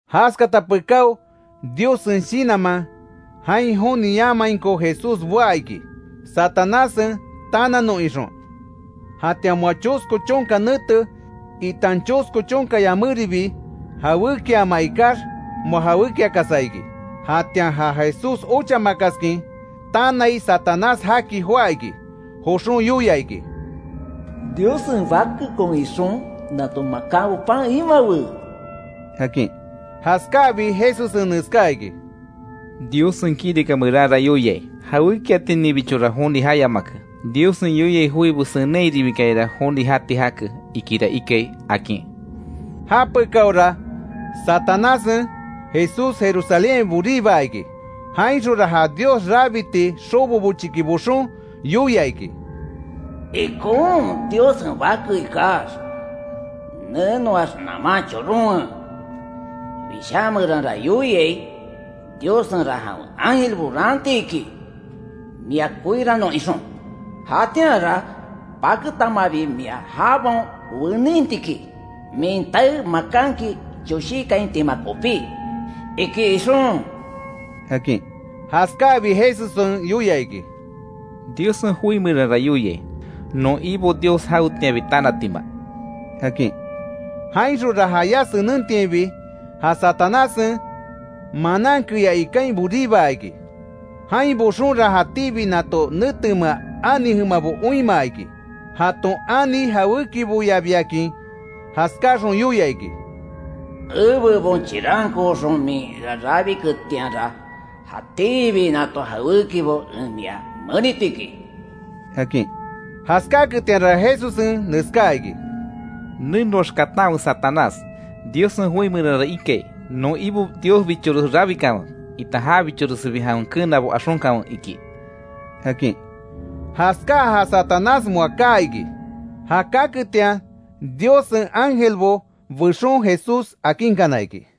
Jaskata pekáo, Diossen Shinanman, jain joni jayamainko Jesús boá iki, Satanássen tananon ixon. Jatian, moa chosko chonka nete, itan chosko chonka yaméribi, jawékiaama ikax moa jawékiakasa iki. Jatian, ja Jesús ochamakaskin tanai, Satanás jaki joá iki, joxon yoia iki: —Diossen Bakekon ixon, nato makanbo pan imawe —akin. Jaskáabi, Jesussen neskáa iki: —Diossen kirika meranra yoiai: ‘Jawékiatininbichora joni jayamake, Diossen yoiai joibo senenhairibikayara joni jati jake, ikira ikai’ —akin. Japekaora, Satanássen Jesús Jerusalénhain boríbaa iki. Jainxonra ja Dios rabiti xobo bochiki boxon, yoia iki: —Ikon Diossen Bake ikax, nenoax naman choronwe, Wishá meranra yoiai: ‘Diossenra jawen ángelbo raanti iki, mia koirannon ixon. Jatianra paketamabi mia jabaon weninti iki, min tae makanki choshíkaintima kopí’, iki ixon —akin. Jaskáabi, Jesussen yoia iki: —Diossen joi meranra yoiai: ‘Non Ibo Dios jawetianbi tanatima’ —akin. Jainxonra jayá senentiainbi, ja Satanássen manan keyá ikain boríbaa iki. Jain boxonra, jatíbi nato netemea ani jemabo oinmaa iki, jaton ani jawékiboyabiakin. Jaskáaxon yoia iki: —Ebebon chirankooxon min ea rabiketianra, jatíbi nato jawékibo en mia meniti iki —akin. Jaskáaketianra Jesussen neskáa iki: —Nenoax katanwe Satanás. Diossen joi meranra ikai: ‘Non Ibo Diosbichores rabikanwe, itan jabichoresibi jawen keenabo axonkanwe iki’ —akin. Jaskáa ja Satanás moa kaa iki. Ja kaketian, Diossen ángelbo bexon, Jesús akinkana iki.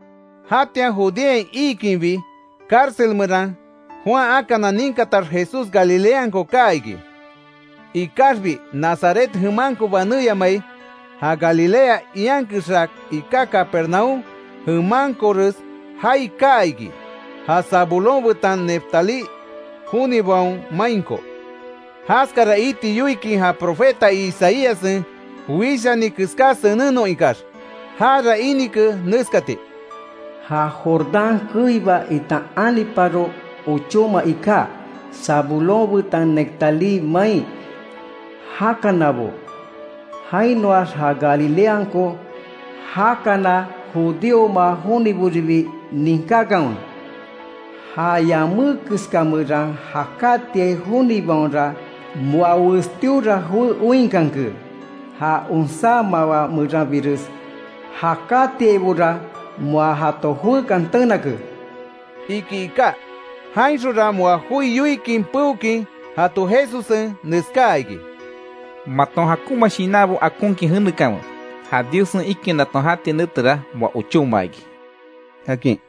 Jatian Judeain iikinbi, cárcel meran Juan akana ninkatax, Jesús Galileanko kaa iki. Ikaxbi, Nazaret jemanko banéyamai, ja Galilea ian kexa iká Capernaúm jemankores jaai kaa iki, ja Zabulón betan Neftalí jonibaon mainko. Jaskara iti yoikin ja profeta Isaíassen wishani keská senennon ikax. Jara inike neskati: “Ja Jordán keiba itan aniparo ochóma iká, Zabulón betan Neftalí main jakanabo; jainoax, ja Galileanko jakana judíoma joniboribi, ninkákanwe: Ja yamé keska meran jakátiai jonibaonra, moa westíora joé oinkanke, ja onsá mawá meranbires jakatiaibora moa jato joekan tenake”, iki iká. Jainxonra moa joi yoikin peokin jato Jesussen neskáa iki: “Maton jakonma shinanbo akonkin jenekanwe, ja Diossen ikinaton jati netera, moa ochóma iki”, akin.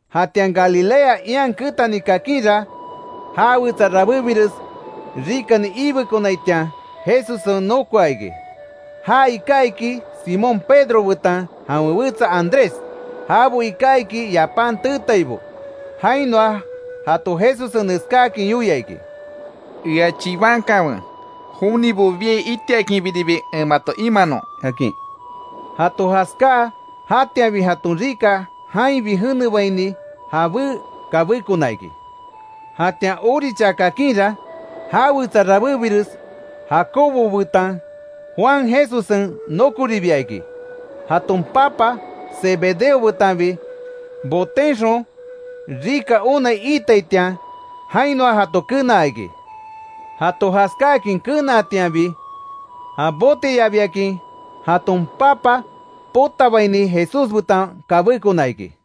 Jatian Galilea ian ketani kakinra, já wetsa rabébires rikani iibekonaitian Jesussen nokoa iki. Ja iká iki Simón Pedro betan jawen wetsa Andrés. Jabo iká iki yapan teetaibo. Jainoa jato Jesussen neskáakin yoia iki: —Ea chibankanwe, jonibo biai itiakinbiribi en mato imanon —akin. Jato jaskáa, jatianbi jaton rika jainbi jenebaini, jabé kabékona iki. Jatian orichaa kakinra, já wetsa rabébires Jacobo betan Juan Jesussen nokoribia iki, jaton papa Zebedeo betanbi botenxon rika onai iitaitian. Jainoa jato kenaa iki. Jato jaskáakin kenaatianbi, ja boteyabiakin jaton papa potabaini, Jesús betan kabékona iki.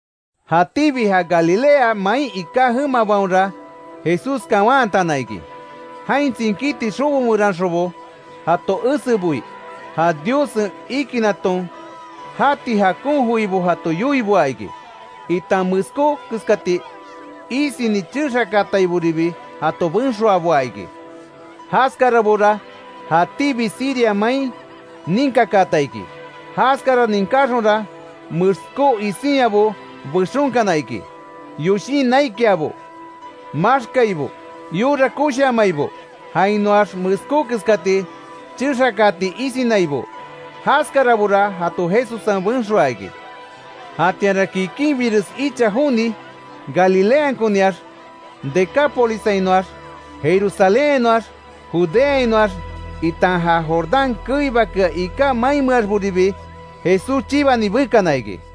Jatíbi ja Galilea main iká jemabaonra Jesús kawantana iki, jain tsinkíti xobo meranxonbo jato eseboi. Ja Diossen ikinaton jati jakon joibo jato yoiboa iki, itan meskó keskati isini chexakaataiboribi jato benxoaboa iki. Jaskarabora jatíbi Siria main ninkakaata iki; jaskara ninkáxonra, meskó isinyabo bexonkana iki. Yoshin naikiabo, maxkaibo, yora koshiamaibo; jainoax meskó keskati chexakaati isinaibo. Jaskarabora jato Jesussen benxoaa iki. Jatianra kikinbires icha joni, Galileankoniax, Decápolissainoax, Jerusalénhainoax, Judeainoax itan ja Jordán keibakea iká mainmeaxboribi Jesús chibani bekana iki.